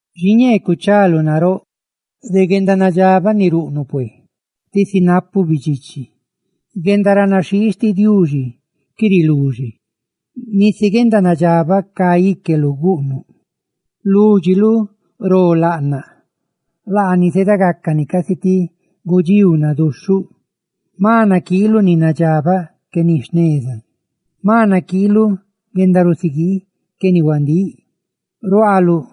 Xiñee cuchaluꞌ naróꞌ de guendanadxabaꞌ ni ruꞌnuꞌ pué, tisi napuꞌ bidxichi. ¡Guendaranaxhii xtiꞌ Diuxi qué riluxe! Nisi guendanadxabaꞌ cá íqueluꞌ guꞌnuꞌ; lúdxiluꞌ ro laꞌnaꞌ, laani zeeda gácani casi ti gudxíu naduxhuꞌ. Jma naquiiluꞌ ni nadxabaꞌ que ni jneza, jma naquiiluꞌ guendarusiguii que ni huandíꞌ. Ruaaluꞌ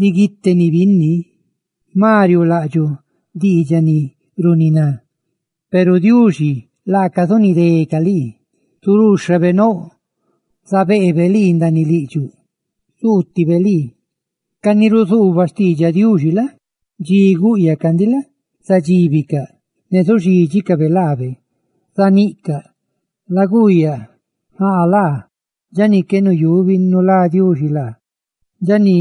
riguíteni binni, jma riuulaꞌdxuꞌ diidxaꞌ ni runiná; peru Diuxi laaca zunidé lii; zuruuxhabe nouꞌ zabeebe lii ndaaniꞌ lídxiluꞌ; zuutibe lii. Ca ni ruzuubaꞌ xtiidxaꞌ Diuxi la? dxi gúꞌyacaꞌ ndiꞌ la? zadxíbicaꞌ; ne zuxídxicabe laabe, zaníꞌcabe: «Laguuyaꞌ, njáꞌa laa dxa ni qué nuyubi nulá Diuxi laa, dxa ni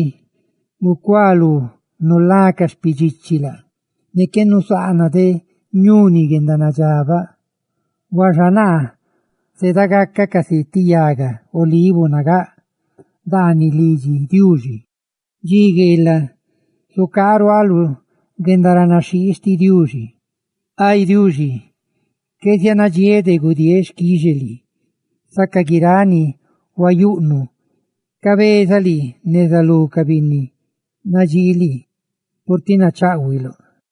gucualú nulá ca xpidxichi laa, ne qué nusaana de ñuni guendanadxabaꞌ.» Huaxa naa zeeda gacaꞌ casi ti yaga olivo nagáꞌ ndaaniꞌ lidxi Diuxi; ¡dxi gueelaꞌ zucaaꞌ ruaaꞌ lu guendaranaxhii xtiꞌ Diuxi! Ay Diuxi, qué zianadxiéꞌ de gudieeꞌ xquixe lii, saca guiráꞌ ni huayuꞌnuꞌ; cabezaꞌ lii neza lú ca binni nadxii lii, purtiꞌ nacháꞌhuiluꞌ.